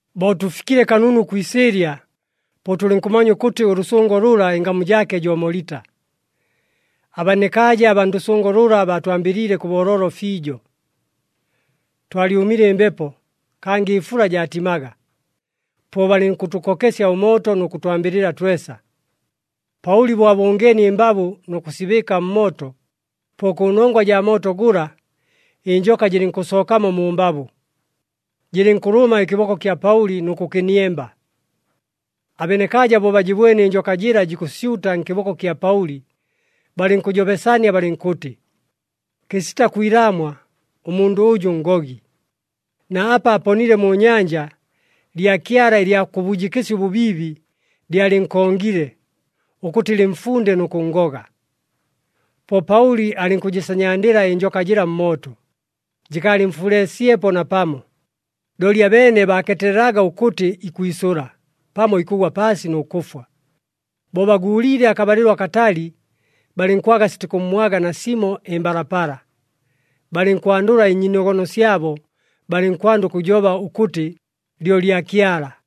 Bo tʉfikile kanunu kwi isɨɨlya, po tʉlɨnkʉmanya ʉkʉtɨ ʉlʉsʉngo lʉla ɨngamu jaake jo Molita. Abenekaaja abaa ndʉsʉngo lʉla, baatwambɨliile kʉ booloolo fiijo. Twalyʉmile ɨmbepo, kangɨ ɨfula jaatimaga, po balɨnkʉtʉkokesya ʉmooto nʉ kʉtwambɨlɨla twesa. Paʉli bo abʉngeenie ɨmbabʉ nʉ kʉsibɨɨka mmooto, po kʉnongwa jaa mooto gʉla ɨnjoka jɨlɨnkʉsookamo mu mbabʉ, jɨlɨnkʉlʉma ɨkɨboko kya Paʉli nʉ kʉkɨniemba. Abenekaaja bo bajɨbwene ɨnjoka jɨla jikʉsyuta nkɨboko kya Paʉli, balɨnkʉjobesania balɨnkʉtɨ, “Kɨsita kwilaamwa ʉmundʉ ʉjʉ ngogi. Na apa aponile mu nyanja, lyakyala ɨlya kʉbujɨkɨsya ʉbʉbiibi lyalɨnkongile, ʉkʉtɨ lɨmfunde nʉ kʉnngoga.” Po Paʉli alɨnkʉjɨsanyandɨla ɨnjoka jɨla mmooto, jɨkaalɨmfuleesyepo napamo. Looli abeene baakeetelelaga ʉkʉtɨ ikwisʉla, pamo ikʉgwa paasi nʉ kʉfwa. Bo baguuliile akabalɨlo akatali, balɨnkwaga sitikʉmmwaga nasimo ɨmbalapala, balɨnkwandʉla ɨnyiinogono syabo, balɨnkwanda ʉkʉjoba ʉkʉtɨ lyo lyakyala.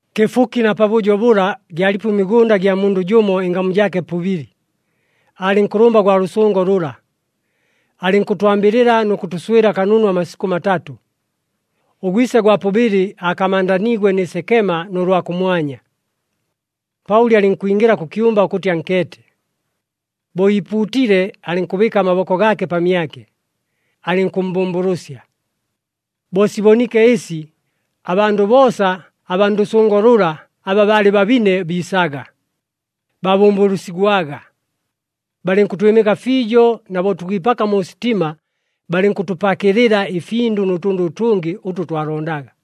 Kɨfuki na pabʉjo bʉla, gyalipo ɨmigʉnda gya mundʉ jʉmo ɨngamu jaake Pubili, aalɨ nkʉlʉmba gwa lʉsʉngo lʉla. Alɨnkʉtwambɨlɨla nʉ kʉtʉswɨla kanunu amasikʉ matatʉ. Ʉgwise gwa Pubili aakamandaniigwe nɨ sekema nʉ lwa kʉmwanya. Paʉli alɨnkwingɨla kʉ kyumba ʉkʉtɨ ankeete. Bo iipuutile, alɨnkʉbɨɨka amaboko gaake pamyake, alɨnkʉmmbʉmbʉlʉsya. Bo siboniike ɨsi, abandʉ boosa aba ndʉsʉngo lʉla aba baalɨ babine biisaga, baabʉmbʉlʉsigwaga. Balɨnkʉtwɨmɨka fiijo, na bo tukwipaka mu sitima balɨnkʉtʉpakɨlɨla ɨfindʉ nʉ tʉndʉ ʉtʉngɨ ʉtʉ twalondaga.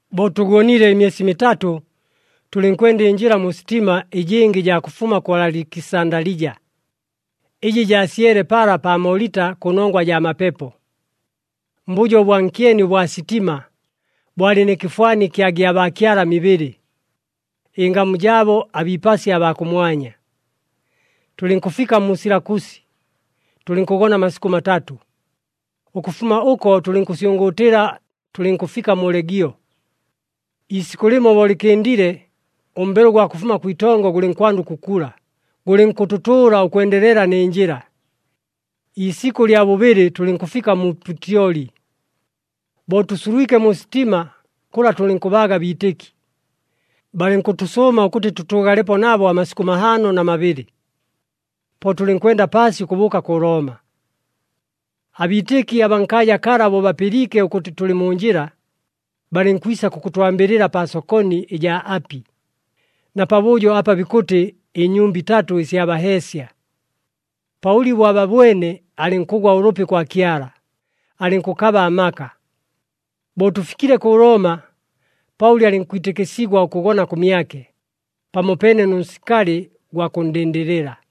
Bo tʉgonile ɨmyesi mitatʉ, tʉlɨnkwenda ɨnjɨla mu sitima ɨjɨngɨ ɨjaa kʉfuma kʉ Alikisandalija, ɨjɨ jaasyele pala pa Molita kʉnongwa jaa mapepo. Mbʉjo ʉbwa nkyeni ʉbwa sitima, bwalɨ nɨ kɨfwani kya gyabaakyala mibɨlɨ, ɨngamu jaabo abiipasya abaa kʉmwanya. Tʉlɨnkʉfika mu Silakusi, tʉlɨnkʉgona amasikʉ matatʉ. Ʉkʉfuma ʉko tʉlɨnkʉsyʉngʉʉtɨla, tʉlɨnkʉfika mu Legio. Iisikʉ lɨmo bo lɨkɨndile, ʉmbelo ʉgwa kʉfuma kwitongo gʉlɨnkwanda ʉkʉkula, gʉlɨnkʉtʉtʉʉla ʉkwendelela nɨ njɨla. Iisikʉ lya bʉbɨlɨ tʉlɨnkʉfika mu Putyoli. Bo tʉsulwike mu sitima, kʉla tʉlɨnkʉbaaga abiitɨki. Balɨnkʉtʉsʉʉma ʉkʉtɨ tʉtʉʉgalepo nabo amasikʉ mahaano na mabɨlɨ. Po tʉlɨnkwenda paasi ʉkʉbʉʉka kʉ Looma. Abiitɨki abaa nkaaja kala bo bapɨliike ʉkʉtɨ tʉlɨ mu njɨla, balɨnkwisa kʉkʉtwambɨlɨla pa Sokoni ɨjaa Api, na pabʉjo apa bikʉtɨ ɨNyumba iTatʉ ɨsya Baheesya. Paʉli bo ababwene alɨnkʉgwa ʉlʉpi kwa Kyala, alɨnkʉkaba amaka. Bo tʉfikile kʉ Looma, Paʉli alɨnkwitɨkɨsigwa ʉkʉgona kʉmyake, pamopeene nʉ nsikali gwa kʉnndɨndɨlɨla.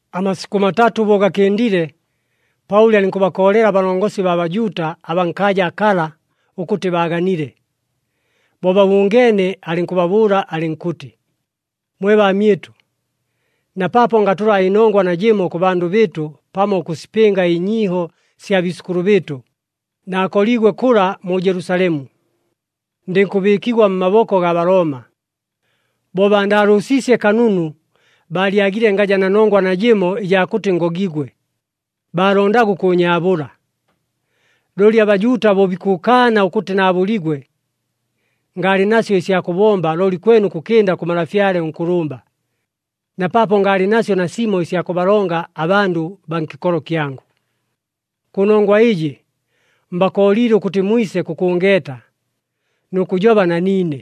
Amasikʉ matatʉ bo gakɨndile, Paʉli alɨnkʉbakoolela abalongosi baa Bajuuta abaa nkaaja kala ʉkʉtɨ baaganile. Bo babʉngeene, alɨnkʉbabʉʉla alɨnkʉtɨ, “Mwe baamyɨtʉ, na paapo ngatʉla ɨnongwa najɨmo kʉ bandʉ bɨɨtʉ pamo ʉkʉsipɨnga ɨnyiiho sya biisʉkʉlʉ bɨɨtʉ, naakoliigwe kʉla mu Jelusalemu, ndɨnkʉbɨɨkigwa mmaboko gaa Balooma. Bo baandaalʉʉsiisye kanunu, baalyagile ngaja na nongwa najɨmo ɨjaa kʉtɨ ngogigwe, baalondaga ʉkʉʉnyaabʉla. Looli aBajuuta bo bikʉkaana ʉkʉtɨ naabʉligwe, ngaalɨ nasyo ɨsya kʉbomba looli kwene ʉkʉkɨnda kʉ malafyale ʉnkʉlʉmba, na paapo ngaalɨ nasyo nasimo ɨsya kʉbalonga abandʉ baa nkɨkolo kyangʉ. Kʉnongwa ɨjɨ, mbakooliile ʉkʉtɨ mwise kʉkʉngeeta, nʉ kʉjoba na niine.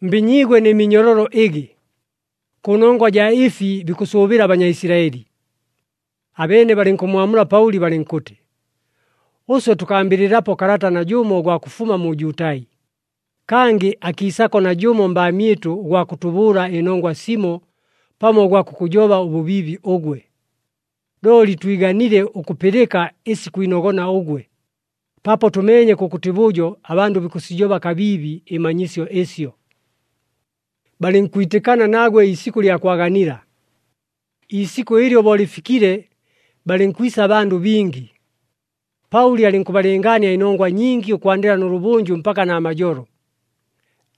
Mbinyiigwe nɨ minyololo ɨgɨ kʉnongwa ɨjaa ɨfi bikʉsʉʉbɨla aBanyaisilaɨli.” Abeene balɨnkʉmmwamula Paʉli balɨnkʉtɨ, “Ʉswe tʉkambɨlɨlapo kalata najʉmo ʉgwa kʉfuma mu Jutai, kangɨ akiisako najʉmo mbaamyɨtʉ ʉgwa kʉtʉbʉʉla ɨnongwa simo pamo ʉgwa kʉkʉjoba ʉbʉbiibi ʉgwe. Looli twiganile ʉkʉpɨlɨka ɨsi kwinogona ʉgwe, paapo tʉmeenye kʉkʉtɨ bʉjo abandʉ bikʉsijoba kabiibi ɨmanyisyo ɨsyo.” Balɨnkwitɨkana nagwe iisikʉ lya kwaganila. Iisikʉ ɨlyo bo lɨfikile, balɨnkwisa abandʉ bingi. Paʉli alɨnkʉbalɨngaania ɨnongwa nyingi ʉkwandɨla nʉlʉbʉnjʉ mpaka namajolo,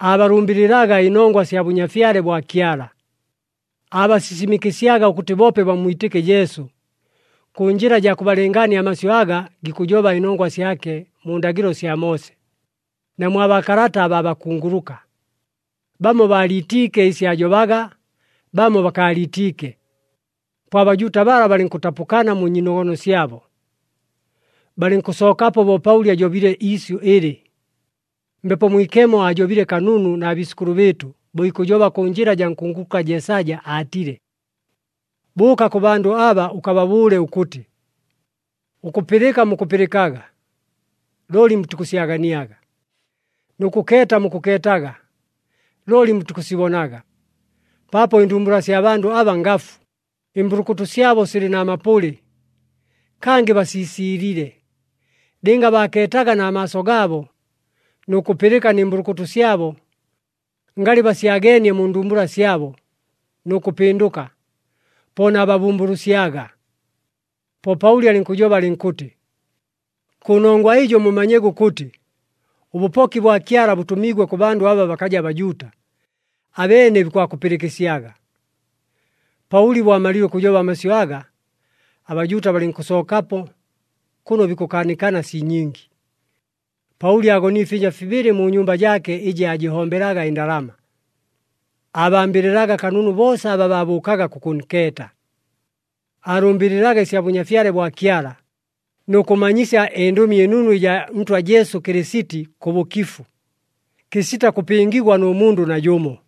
aabalʉmbɨlɨlaga ɨnongwa sya Bʉnyafyale bwa Kyala. Aabasisimɨkɨsyaga ʉkʉtɨ boope bammwitɨke Jesu, kʉ njɨla jaa kʉbalɨngaania amasyʉ aga gikʉjoba ɨnongwa syake mu ndagɨlo sya Moose, na mwa baakalata abaa bakunguluka. Bamo baaliitiike ɨsi aajobaga, bamo bakaaliitiike. Po aBajuuta bala balɨnkʉtapʉkana mu nyiinogono syabo, balɨnkʉsookapo bo Paʉli ajobile iisyʉ ɨlɨ, “Mbepo Mwikemo aajobile kanunu na biisʉkʉlʉ bɨɨtʉ, bo ikʉjoba kʉ njɨla jaa nkunguluka Jeesaja, aatile, ‘Bʉʉka kʉ bandʉ aba, ʉkababʉʉle ʉkʉtɨ, ʉkʉpɨlɨka mukʉpɨlɨkaga, looli mutikʉsyaganiaga. Nʉ kʉkeeta mukʉkeetaga, looli mutikʉsibonaga. Paapo ɨndumbula sya bandʉ aba ngafu, ɨmbʉlʉkʉtʉ syabo silɨ na mapʉlɨ, kangɨ basiisiilile. Lɨnga baakeetaga na maaso gaabo, nʉ kʉpɨlɨka nɨ mbʉlʉkʉtʉ syabo, ngalɨ basyageenie mu ndumbula syabo, nʉ kʉpɨndʉka, po naababʉmbʉlʉsyaga.’” Po Paʉli alɨnkʉjoba alɨnkʉtɨ, “Kʉnongwa ɨjo mumanyege ʉkʉtɨ, ʉbʉpoki bwa Kyala bʉtʉmiigwe kʉ bandʉ aba bakaja Bajuuta, abeene bikwakʉpɨlɨkɨsyaga.” [ Paʉli bo amalile ʉkʉjoba amasyʉ aga, aBajuuta balɨnkʉsookapo kʉno bikʉkaanikana sii nyingi.] Paʉli aagonile ɨfyɨnja fibɨlɨ mu nyumba jaake ɨjɨ aajɨhombelaga ɨndalama. Aabambɨlɨlaga kanunu boosa aba baabʉʉkaga kʉkʉnkeeta. Aalʉmbɨlɨlaga ɨsya Bʉnyafyale bwa Kyala, nʉ kʉmanyisya ɨNdʉmi ɨNunu ɨjaa Ntwa Jesu Kɨlɨsiti, kʉ bʉkifu, kɨsita kʉpɨngigwa nʉ mundʉ najʉmo.